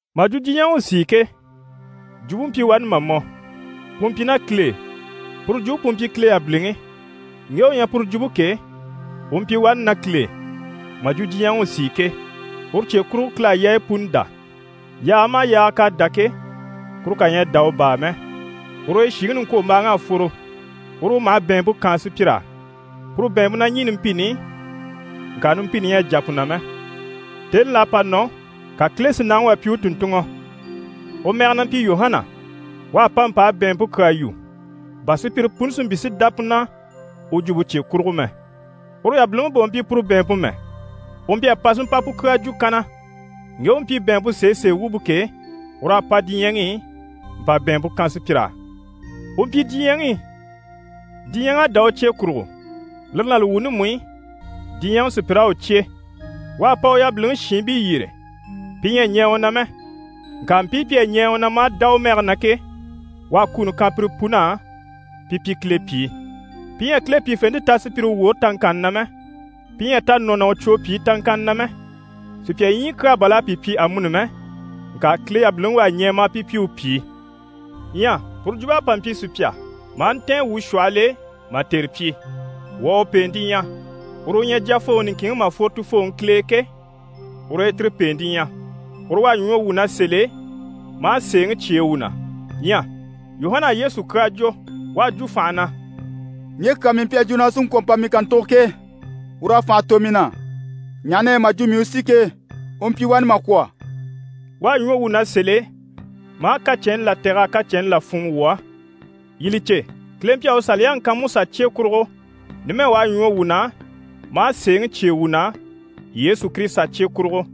Mà jwo diɲyɛŋi u sìi ke, Jwumpe mpyi wani mà mɔ. Pu mpyi ná Kile e. Puru Jwumpe pu mpyi Kile yabiliŋi. Ŋge u ɲyɛ puru Jwumpe ke, u mpyi wani ná Kile e, mà jwo diɲyɛŋi u sìi ke. Uru cye kurugo Kile à yaayi puni dá. Yaaga maha yaaga k'à dá ke, kuru kà ɲyɛ a dá u baa mɛ. Ur'e shìŋi niŋkwombaaŋ'à fworo, uru u maha bɛ̀ɛnmpe kaan sùpyir'á. Puru bɛ̀ɛnmpe na ɲî numpini i, ŋka numpini ɲyɛ a jà pu na mɛ. Tèni là à pa nɔ, ka Kile si nàŋi wà pyi u tùnntunŋɔ, u mɛge na mpyi Yuhana. U à pa mpa a bɛ̀ɛnmpe kyaa yu, bà sùpyire puni si mpyi si dá pu na u jwumpe cye kurugo mɛ. Uru yabiliŋi bà u mpyi puru bɛ̀ɛnmpe mɛ, u mpyi a pa si mpa pu kyaa jwo kanna. Ŋge u mpyi bɛ̀ɛnmpe sèesee wumpe ke, ur'à pa diɲyɛŋi i mpa bɛ̀ɛnmpe kan sùpyir'á. U mpyi diɲyɛŋi i, diɲyɛŋ'à dá u cye kurugo, lire ná li wuuni mú i, diɲyɛŋi sùpyir'à u cyé. U à pa u yabiliŋi shiinbii yyére, pi ɲyɛ a ɲɛɛ u na mɛ. Ŋka mpii pi à ɲɛɛ u na maa dá u mɛge na ke, u à kuni kan pire pun'á pi pyi Kile pyìi. Pi ɲyɛ a Kile pyìfente ta sùpyire woore taŋkanni na mɛ. Pi ɲyɛ a ta nɔ ná u cwo pyìi taŋkanni na mɛ. Sùpya ɲyii kyaa bà l'à pi pyi amuni mɛ. Ŋka Kile yabiliŋi u à ɲɛɛ maa pi pyi u pyìi. Ɲyɛ puru Jwumpe à pa mpyi sùpya, maa ntɛ̀ɛn wuu shwɔhɔl'e mà tère pyi. Wuu à u pèente ɲya. Uru u ɲyɛ Jyafooŋi niŋkinŋi mà fworo Tufooŋi Kile e ke, ur'e tire pèente ɲyɛ. Uru u à ɲwɔ wuu na sèl'e, maa sèeŋi cyêe wuu na. Ɲyɛ Yuhana à Yesu kyaa jwo. U à jwo fànha na: «Ŋge kyaa mii mpyi a jwo na u sí n‑kwɔ̀ n‑pa mii kàntugo ke, ur'à fànha tò mii na, ɲaha na yɛ mà jwo mii u si ke, u mpyi wani mà kwɔ̀.» U à ɲwɔ wuu na sèl'e maa kacɛnni là tɛ̀g'a kacɛnni là fûnŋɔ wuu á. Yii li cè, Kile mpyi a u Saliyaŋi kan Musa cye kurugo, numɛ u à ɲwɔ wuu na maa sèeŋi cyêe wuu na Yesu Kirisita cye kurugo.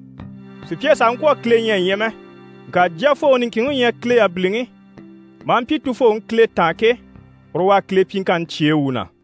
Sùpya sàha ŋkwɔ̀ a Kile ɲya a ɲya mɛ. Ŋka Jyafooŋi niŋkinŋi u ɲyɛ Kile yabiliŋi, maa mpyi Tufooŋi Kile taan ke, uru u à Kile pyiŋkanni cyêe wuu na.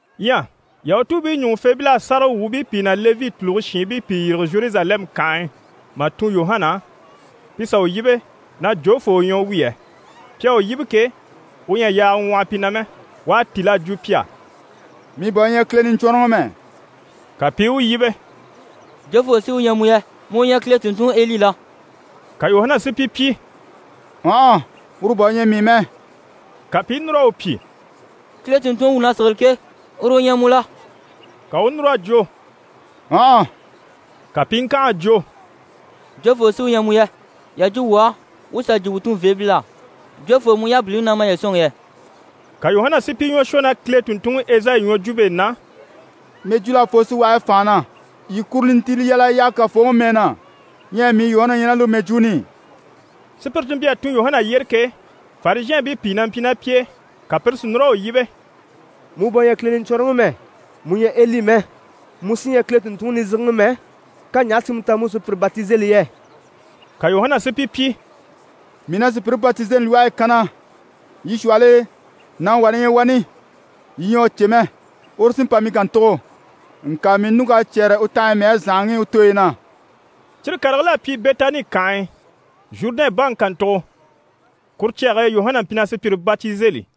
Ɲyɛ Yahutuubii ɲùŋufeebil'à sáragawwuubii pìi ná Levi tùluge shiinbii pìi yîrige Zheruzalɛmu kànhe e mà tun Yuhana á, pi sà u yíbe na jofoo u ɲyɛ u wi yɛ? Pi à u yíbe ke, u ɲyɛ a yaaga ŋwɔhɔ pi na mɛ, u à tíl'a jwo pi á: «Mii bà u ɲyɛ Kile Niɲcwɔnrɔŋi mɛ.» Ka pi i u yíbe: «Jofoo sí u ɲyɛ mu yɛ? Mu u ɲyɛ Kile tùnntunŋiEli la?» Ka Yuhana si pi pyi: «Ɔnhɔ, uru bà u ɲyɛ mii mɛ.» Ka pi i núr'a u pyi: «Kile tùnntunŋi wuu na sigili ke, uru u ɲyɛ mu la?» Ka u u núr'a jwo: «Ɔnhɔ.» Ka pi i ŋkànha a jwo: «Jofoo sí u ɲyɛ mu yɛ? Yà jwo wuu á, wuu sà jwo wuu tunveebil'á. Jofoo mu yabiliŋi na maye sɔ̂nŋi yɛ?» Ka Yuhana si pi ɲwɔ shwɔ ná Kile tùnntunŋi Ezayi ɲwɔjwumpe e na: «Mɛjwul'à fworo síwage e fànha na “Yii kuro nintiile yal'a yaha Kafooŋi mɛɛ na.” Ɲyɛ mii Yuhana u ɲyɛ ná lire mɛjwuuni i.» Sùpyire ti mpyi a tun Yuhana yyére ke, Farizhɛɛnbii pìi na mpyi ná pi e. Ka pire si núr'a u yíbe: «Mu bà u ɲyɛ Kile Niɲcwɔnrɔŋi mɛ, mu ɲyɛ Eli mɛ, mu sí ɲyɛ Kile tùnntunŋi nizigiŋi mɛ, ka ɲaha si mu ta mu u sùpyire batizeli yɛ?» Ka Yuhana si pi pyi: «Mii na sùpyire batizeli lwɔhe e kanna. Yii shwɔhɔl'e, nàŋi wà na ɲyɛ wani, yii ɲyɛ a u cè mɛ, uru sí n‑pa mii kàntugo, ŋka mii ɲùŋk'à cyɛ́rɛ u tanhaɲyi mɛɛre zànhaŋi i u tooyi na.» Cyire karigil'à pyi Bɛtani kànhe e, Zhurudɛn baŋi kàntugo. Kuru cyage e, Yuhana mpyi na sùpyire batizeli.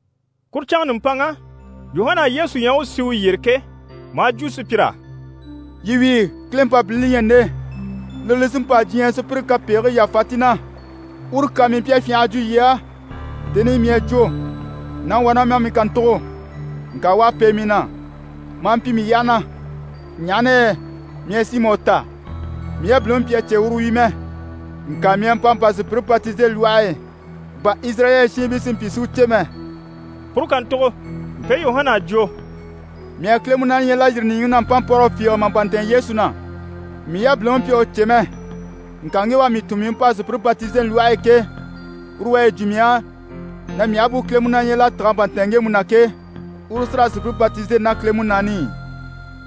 Kuru canŋa nùmpanŋa, Yuhana à Yesu ɲya u u sì u yyére ke, maa jwo sùpyir'á: «Yii wíi, Kile Mpabilini li ɲyɛ nde, lire li sí n‑pa diɲyɛ sùpyire kapegigii yàfa ti na. Uru kyaa mii mpyi a fyânha a jwo yii á, tèni i mii à jwo “Nàŋi wà na ma mii kàntugo, ŋka u à pêe mii na, maa mpyi mii yyaha na, ɲaha na yɛ mii à si mà u ta.” Mii yabiliŋi mpyi a cè na uru wi mɛ. Ŋka mii à pa mpa a sùpyire batizeli lwɔhe e, bà Izirayɛli shiinbii si mpyi si u cè mɛ.» Puru kàntugo, mpe Yuhana à jwo: «Mii à Kile Munaani ɲya l'à yîri nìɲyiŋi na mpánmpɔrɔgɔ fiige, mà pa ntɛ̀ɛn Yesu na. Mii yabiliŋi mpyi a u cè mɛ. Ŋka ŋge u à mii tun mii u pa a sùpyire batizeli lwɔhe e ke, uru u à yi jwo mii á na mii aha bú Kile Munaani ɲya l'à tîg'a pa ntɛ̀ɛn ŋgemu na ke, uru u sí raa sùpyire batizeli ná Kile Munaani i.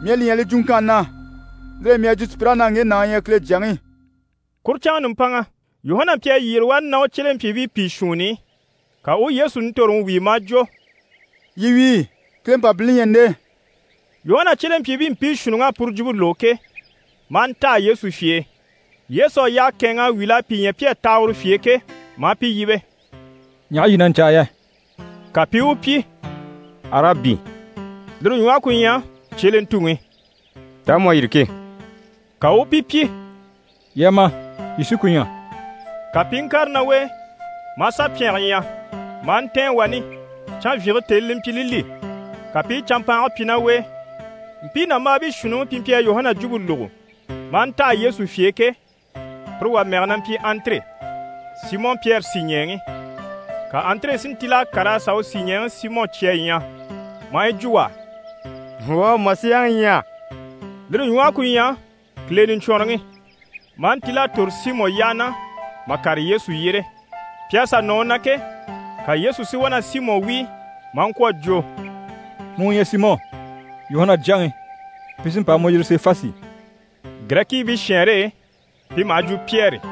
Mii à li ɲya li jwuŋkanni na. Lire e mii à jwo sùpyir'á na “Ŋge nàŋi u ɲyɛ Kile Jyaŋi.”» Kuru canŋa nùmpanŋa, Yuhana mpyi a yyére wani ná u cyelempyiibii pìi shuunni i. Ka u u Yesu nintoroŋi wíi, maa jwo: «Yii wíi, Kile Mpabilini li ɲyɛ nde!» Yuhana cyelempyiibii mpii shuunniŋ'à puru jwumpe lógo ke, maa ntaha Yesu fye e. Yesu à yyahe kɛ̂ɛnŋ'a wíl'a pi ɲya pi à taha uru fye e ke, maa pi yíbe: «Ɲaha yii na ɲcaa yɛ?» Ka pi i u pyi: «Arabi (lire ɲwɔhe ku ɲyɛ cyelentuŋi) taa mu à tîrige ke?» Ka u u pi pyi: «Yii a ma, yii sí ku ɲya.» Ka pi i ŋkàre ná u e, maa sà pyɛnge ɲya, maa ntɛ̀ɛn wani. Canvyinge tèni li mpyi li li, ka pi i canmpaange pyi ná u e. Mpii nàmbaabii shuunniŋi pi mpyi a Yuhana jwumpe lógo, maa ntaha Yesu fye e ke, pire wà mɛge na mpyi Andire, Simɔ Pyɛri sìɲɛɛŋi. Ka Andire si ntíl'a kàr'a sà u sìɲɛɛŋi Simɔ cya a ɲya, maa yi jwo u á: «Wuu à Masiyaŋi ɲya.» (Lire ɲwɔhe ku ɲyɛ Kile Niɲcwɔnrɔŋi.) Maa ntíl'a tòro Simɔ yyaha na mà kàre Yesu yyére. Pi à sà nɔ u na ke, ka Yesu si wá na Simɔ wíi maa ŋkwɔ̀ a jwo: «Mu u ɲyɛ Simɔ, Yuhana jyaŋi, pi sí n‑pa a mu yiri Sefasi.» (Girɛkiibii shɛɛnre e, pi maha jwo: «Pyɛri».)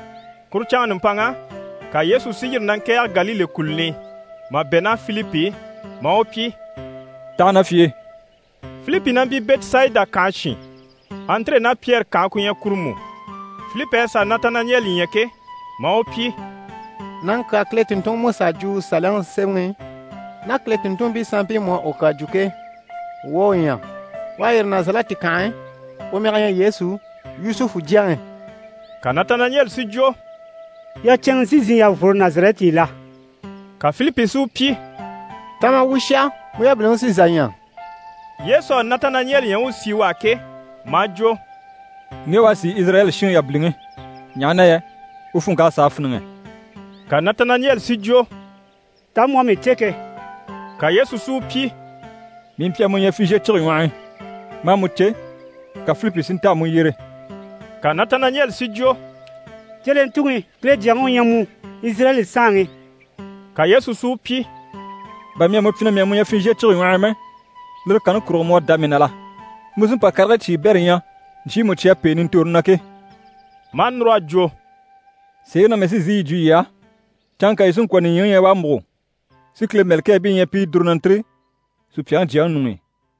Kuru canŋa nùmpanŋa, ka Yesu si yîri na ŋkɛ̀ɛge Galile kùluni i, mà bɛ̂ ná Filipi i, maa u pyi: «Taha na fye e!» Filipi na mpyi Bɛtisayida kànhe shin. Andire ná Pyɛri kànhe ku ɲyɛ kuru mú. Filipi à sà Natanayɛli ɲya ke, maa u pyi: «Nàŋi kyaa Kile tùnntunŋi Musa à jwo u Saliyaŋi sémɛŋi i, ná Kile tùnntunmpii sanmpii mú à u kyaa jwo ke, wuu à u ɲya. U à yîri Nazarɛti kànhe e, u mɛge ɲyɛ Yesu, Yusufu jyaŋi.» Ka Natanayɛli si jwo: «Yacɛnŋɛ sí n‑sìi n‑jà n‑fworo Nazarɛti i la?» Ka Filipi si u pyi: «Ta ma wuu u shà, mu yabiliŋi sí n‑sà ɲya.» Yesu à Natanayɛli ɲya u u sì u á ke, maa jwo: «Ŋge à sìi Izirayɛli shinŋi yabiliŋi, ɲaha na yɛ u funŋk'à sàa fíniŋɛ.» Ka Natanayɛli si jwo: «Taa mu à mii cè ke?» Ka Yesu si u pyi: «Mii mpyi a mu ɲya fizhiye cige ɲwɔh'i, maa mu cè, ka Filipi si nta a mu yyere.» Ka Natanayɛli si jwo: «Cyelentuŋi, Kile Jyaŋi u ɲyɛ mu, Izirayɛli Saanŋi.» Ka Yesu si u pyi: «Bà mii à mu pyi na mii à mu ɲya fizhiye cige ɲwɔh'i mɛ, lire kanni kurugo mu à dá mii na la? Mu sí n‑pa karigii cyiibɛrɛ ɲya ɲcyiimu cyi à pêe nintoroni na ke!» Maa núr'a jwo: «Sèeŋi na mii sí n‑sìi yi jwo yii á, canŋka yii sí n‑kwɔ̀ nìɲyiŋi ɲya u à múgo, si Kile mɛ̀lɛkɛɛbii ɲya pi i dùru na ntîri Supyaŋi Jyaŋi ɲuŋ'i.»